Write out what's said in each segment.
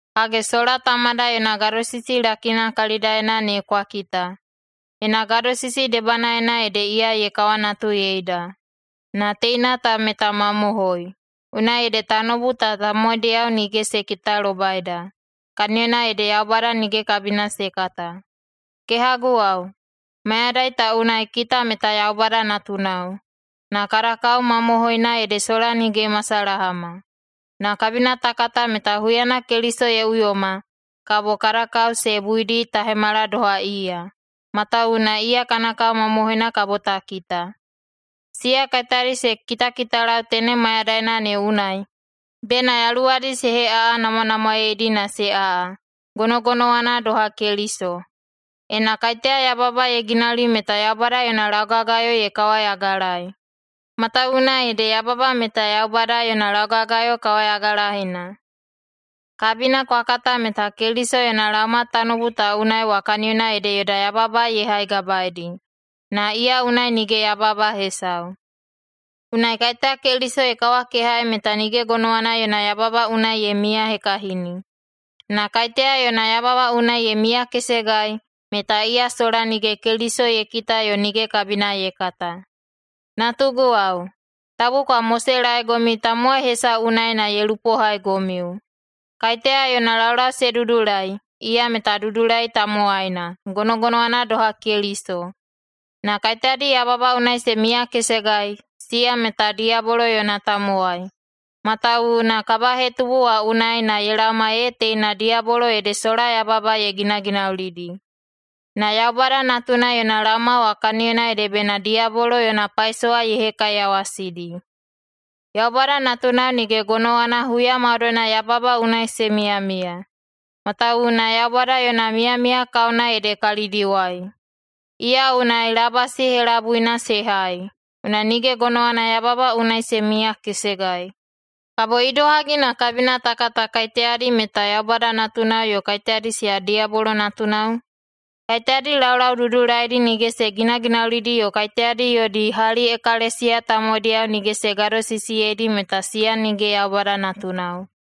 Hage, sola Tamada yona gadosisi lakina kalidaena ne kwa kita! Yona gadosisi debanaena ede iya ye kawanatuyeida. Na teina ta meta mamohoi. Unai ede tanoubu ta tamowaidiyao nige se kitalobaida, kaniyona ede Yaubada nige kabina se kata. Kehaguwao, mayadai ta unai kita meta Yaubada natunao, na kada kao mamohoina ede sola nige ye masalahama. Na kabina ta kata meta huyana Keliso ye uyoma, kabo kada kao se buidi ta hemala doha iya, matawuwuna iya kana kao mamohoina kabo ta kita. Siya kaiteyadi se kitakitalau tenem mayadaina ne unai, bena yaluwadi se heꞌaꞌanamwanamwaeidi na se aꞌa, gonogonowana doha Keliso. Ena kaiteya yababa ye ginauli meta Yaubada yona laugagayo ye kawayagalaei, matawuwuna ede yababa meta Yaubada yona laugagayo kawayagalaena. Kabina kwa kata meta Keliso yona laoma tanoubu ta unai wa kaniyona ede yoda yababa ye haigabaedi, na iya unai nige yababa hesau. Unai kaiteya Keliso ye kawakehaei meta nige gonowana yona yababa unai ye miyahekahini. Na kaiteya yona yababa unai ye miyakesegai, meta iya sola nige Keliso ye kita yo nige kabina ye kata. Natuguwao, tabu kwa moselaegomiu tamowai hesau unai na ye lupohaigomiu. Kaiteya yona laulau se dudulai, iya meta dudulai tamowaina, gonogonowana doha Keliso. Na kaiteyadi yababa unai se miyakesegai, siya meta diyabolo yona tamowai, matawuwuna kabahetubu wa unai na ye laoma ee teina diyabolo ede sola yababa ye ginaginaulidi. Na Yaubada Natuna yona laoma wa kaniyona ede bena diyabolo yona paisowa ye hekaiyawasidi. Yaubada natunao nige gonowana huya maudoina yababa unai se miyamiya, matawuwuna Yaubada yona miyamiya kaona ede kalidiwai. Iya unai labasi helabuina se hai, unai nige gonowana yababa unai se miyakesegai. Kabo idohagi na kabina ta kata kaiteyadi meta Yaubada natunao yo kaiteyadi siya diyabolo natunao? Kaiteyadi laulau dudulaidi nige se ginaginaulidi yo kaiteyadi yodi hali ekalesiya tamowaidiyao nige se gadosisiyeidi, meta siya nige Yaubada natunao.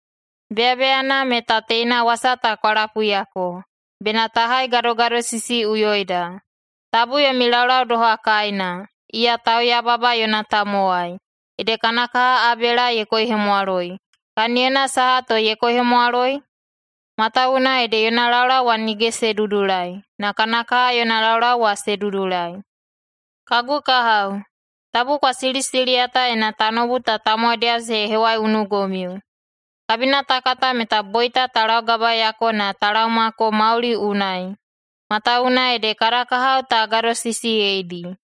Beyabeyana meta teina wasa ta kwa lapuiyako: Bena ta haigadogadosisiꞌuyoida. Tabu yomi laulau doha Kaina, iya tauyababa yona tamowai, ede kana kaha Abela ye koihemwaloi. Kaniyona saha to ye koihemwaloi? Matawuwuna ede yona laulau wa nige se dudulai, na kana kaha yona laulau wa se dudulai. Kagu kahao, tabu kwa silisiliyata ena tanoubu ta tamowaidiyao se hewaiunugomiu. Kabina ta kata meta boita ta laugabaeyako na ta laomako mauli unai, matawuwuna ede kada kahao ta gadosisiyeidi.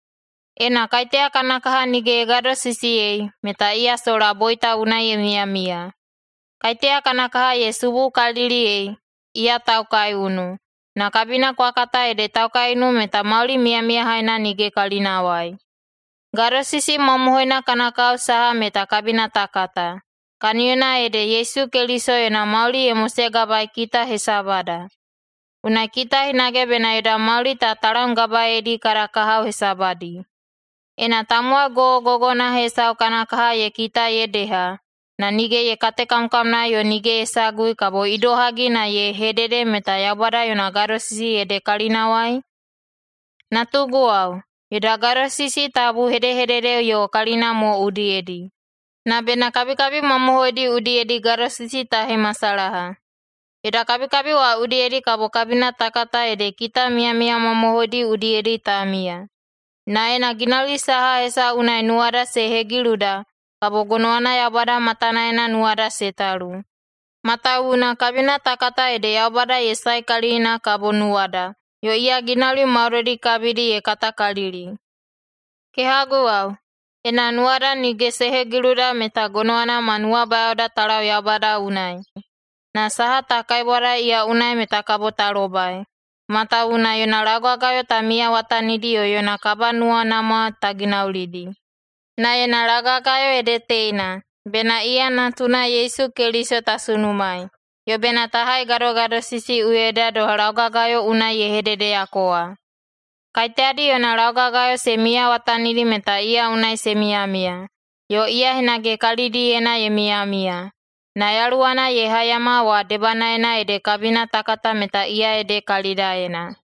Ena kaiteya kana kaha nige ye gadosisiyei, meta iya sola boita unai ye miyamiya. Kaiteya kana kaha ye subukaliliyei, iya taukaiunu, na kabina kwa kata ede taukaiunu meta mauli miyamiyahaina nige kalinawai. Gadosisi mamohoina kana kao saha meta kabina ta kata, kaniyona ede Yesu Keliso yona mauli ye mosegabaei kita hesabada. Unai kita hinage bena yoda mauli ta talamgabaeidi kada kahao hesabadi. Ena tamowai gogogogona hesau kana kaha ye kita ye deha, na nige ye katekamkamnaei yo nige ye sagui, kabo idohagi na ye hedede meta Yaubada yona gadosisi ede kalinawai? Natuguwao, yoda gadosisi tabu hedehedede yo kalina mo udiyedi, na bena kabikabi mamohoidi udiyedi gadosisi ta hemasalaha. Yoda kabikabi wa udiyedi kabo kabina ta kata ede kita miyamiya mamohoidi udiyedi ta miya. Na ena ginauli saha hesau unai nuwada se hegiluda, kabo gonowana Yaubada matanaena nuwada se talu, matawuwuna kabina ta kata ede Yaubada ye saekalili na kabo nuwada, yo iya ginauli maudoidi kabidi ye katakalili. Kehaguwao, ena nuwada nige se hegiluda, meta gonowana ma nuwabayaoda ta lau Yaubada unai, na saha ta kaibwadai iya unai meta kabo ta lobai, matawuwuna yona laugagayo ta miyawatanidi yo yona kabanuwanamwa ta ginaulidi. Na yona laugagayo ede teina: Bena iya Natuna Yesu Keliso ta sunumaei, yo bena ta haigadogadosisiꞌuyoida doha laugagayo unai ye hededeyako wa. Kaiteyadi yona laugagayo se miyawatanidi meta iya unai se miyamiya, yo iya hinage kalidiyena ye miyamiya. Na Yaluwana ye haiyama wa debanaena ede kabina ta kata meta iya ede kalidaena.